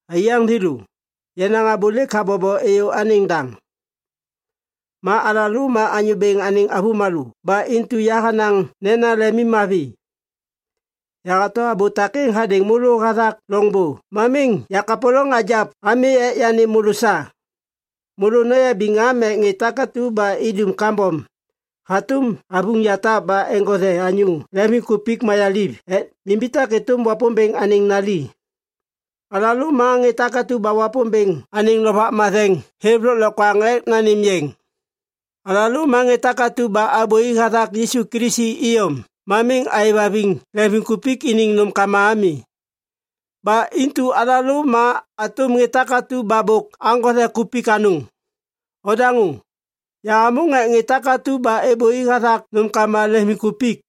Aiyaŋ thêlô, yenaŋ abô lêk habobo êyô anêŋ daŋ. Ma alalô ma Anyô Bêŋ anêŋ avômalô ba intu yahanaŋ nena lemimmavi. Yahato abô takêŋ hadêŋ môlô hathak loŋbô ma miŋ yakapôlôŋ hagiap ami ek yanêm môlô sa. Môlô noyabiŋ am ek ŋê takatu ba idum kambom hatôm avuŋ yatap ba eŋgothe anyô leŋviŋkupik mayaliv ek nimbitak êtôm Wapômbêŋ anêŋ nali. Alalô ma ŋê takatu ba Wapômbêŋ anêŋ Lovak Matheŋ hêv lôklokwaŋ ek nanêm yeŋ. Alalô ma ŋê takatu ba abôi hathak Yisu Kilisi iyom ma miŋ aêvhaviŋ leŋviŋkupik iniŋ nômkama ami. Ba intu alalô ma hatôm ŋê takatu ba bôk aŋgothe kupik anôŋ. Odaŋô, yahamôŋ ek ŋê takatu ba êbôi hathak nômkama leŋviŋkupik.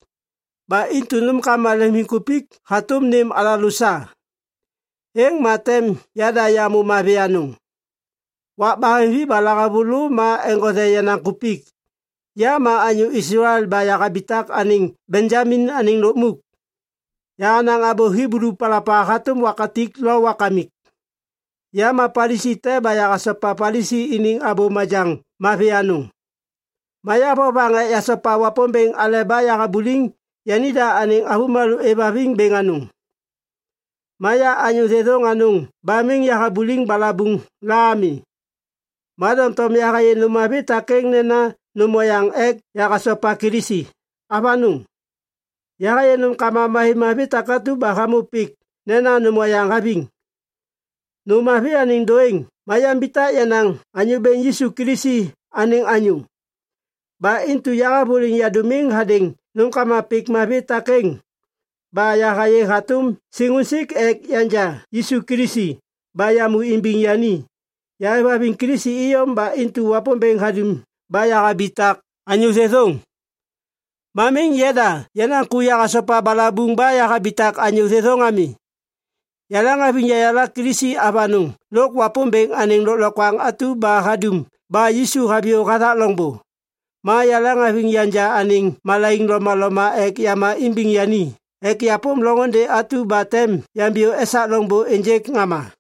Ba intu nômkama leŋviŋkupik hatôm nêm alalô sa, êŋ ma tem yada yamô mavi anôŋ. Wak baheŋvi ba lahavulô ma eŋgothe yenaŋ kupik. Ya ma anyô Islael ba yahabitak anêŋ Benjamin anêŋ lukmuk. Yahanaŋ abô Hiblu palapa hatôm wakatik lo wakamik. Ya ma Palisi te ba yahasopa Palisi iniŋ abô majaŋ mavi anôŋ. Ma ya vovaŋ ek yasopa Wapômbêŋ aleba yahabuliŋ yanida anêŋ avômalô êvhaviŋ bêŋ anôŋ. Ma ya anyô thêthôŋ anôŋ ba miŋ yahabuliŋ balabuŋ la ami. Ma doŋtom yahayê nôm mavi takêŋ nena nôm oyaŋ ek yahasopa Kilisi. Avanôŋ! Yahayê nômkama mavimavi takatu ba hamô pik nena nôm oyaŋ haviŋ. Nôm mavi anêŋ dôêŋ ma yambitak yenaŋ Anyô Bêŋ Yisu Kilisi anêŋ anyô. Ba intu yahavôliŋ yadômiŋ hadêŋ nômkama pik mavi takêŋ ba yahayê hatôm siŋusik ek yanja Yisu Kilisi ba yamô imbiŋ yani. Yahêvhaviŋ Kilisi iyom ba intu Wapômbêŋ hadum ba yahabitak anyô thêthôŋ. Ma miŋ yada yenaŋ ku yahasopa balabuŋ ba yahabitak anyô thêthôŋ ami. Yaleŋhaviŋ yayala Kilisi avanôŋ lôk Wapômbêŋ anêŋ lôklokwaŋ atu ba hadum ba Yisu haviyô hathak loŋbô. Ma yaleŋhaviŋ yanja anêŋ malaiŋ lomaloma ek yama imbiŋ yani ek yapôm loŋôndê atu ba tem yambiyô esak loŋbô ênjêk ŋama.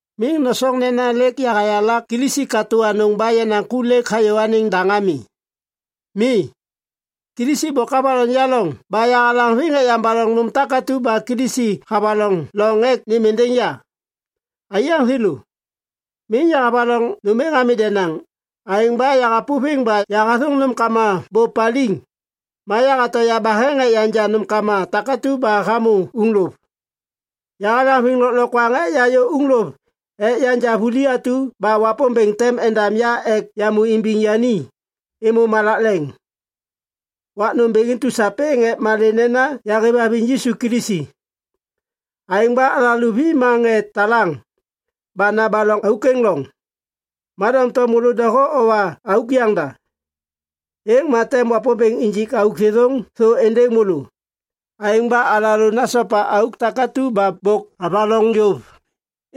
Miŋ nosoŋ nena lêk yahayala Kilisi katô anôŋ ba yenaŋ ku lêk hayô anêŋ daŋ ami. Mi. Kilisi bôk havaloŋ ya loŋ ba yahalaŋviŋ ek yambaloŋ nôm takatu ba Kilisi havaloŋ loŋ ek nêm êndêŋ ya. Aiyaŋ thêlô, miŋ yahavaloŋ nôm êŋ ami denaŋ. Aêŋ ba yahapôviŋ ba yahathôŋ nômkama bô paliŋ ma yahato yabaheŋ ek yanja nômkama takatu ba hamô uŋlôv. Yahalaŋviŋ lôklokwaŋ ek yayô uŋlôv ek yanja vuli atu ba Wapômbêŋ tem endam ya ek yamô imbiŋ yani êmô malak leŋ wak nômbêŋ intu sapêŋ ek malê nena yahêvhaviŋ Yisu Kilisi. Aêŋ ba alalô vi ma ŋê talaŋ ba nabaloŋ auk êŋ loŋ. Ma doŋtom môlô doho owa auk yaŋda, êŋ ma tem Wapômbêŋ injik auk thêthôŋ thô êndêŋ môlô. Aêŋ ba alalô nasopa auk takatu ba bôk avaloŋ yôv.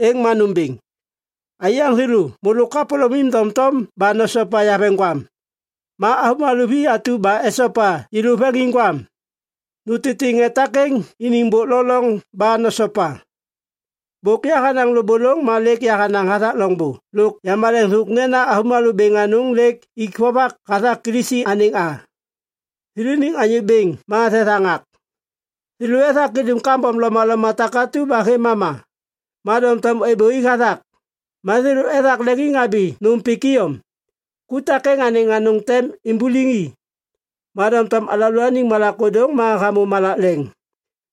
Êŋ ma nômbêŋ. Aiyaŋ thêlô, môlô kapôlômim doŋtom ba nosopa yaveŋgwam. Ma avômalô vi atu ba esopa yêlô veŋiŋgwam, nutitiŋ ŋê takêŋ iniŋ bôk lo loŋ ba nosopa. Bôk yahanaŋ lôbôlôŋ ma lêk yahanaŋ hathak loŋbô lôk yamaleŋ thôk nena avômalô bêŋ anôŋ lêk ik vovak hathak Kilisi anêŋ a. Thêlôniŋ Anyô Bêŋ ma thethaŋak. Thêlô ethak idum kambom lomaloma takatu ba hêv mama, ma doŋtom êbôi hathak. Ma thêlô ethak leŋiŋhabi nôm pik iyom. Ku takêŋ anêŋ anôŋ tem imbuliŋ i. Ma doŋtom alalôaniŋ malak ôdôŋ ma hamô malak leŋ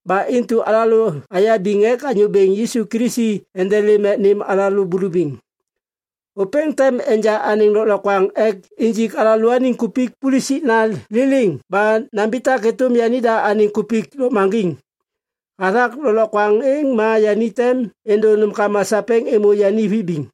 ba intu alalô ayabiŋ ek Anyô Bêŋ Yisu Kilisi endelêm ek nêm alalô bulubiŋ. Ôpêŋ tem enja anêŋ lôklokwaŋ ek injik alalôaniŋ kupik pulusikna liliŋ ba nambitak êtôm yanida anêŋ kupik lôkmaŋgiŋ. Hathak lôklokwaŋ êŋ ma yani tem êndô nômkama sapêŋ êmô yani vibiŋ.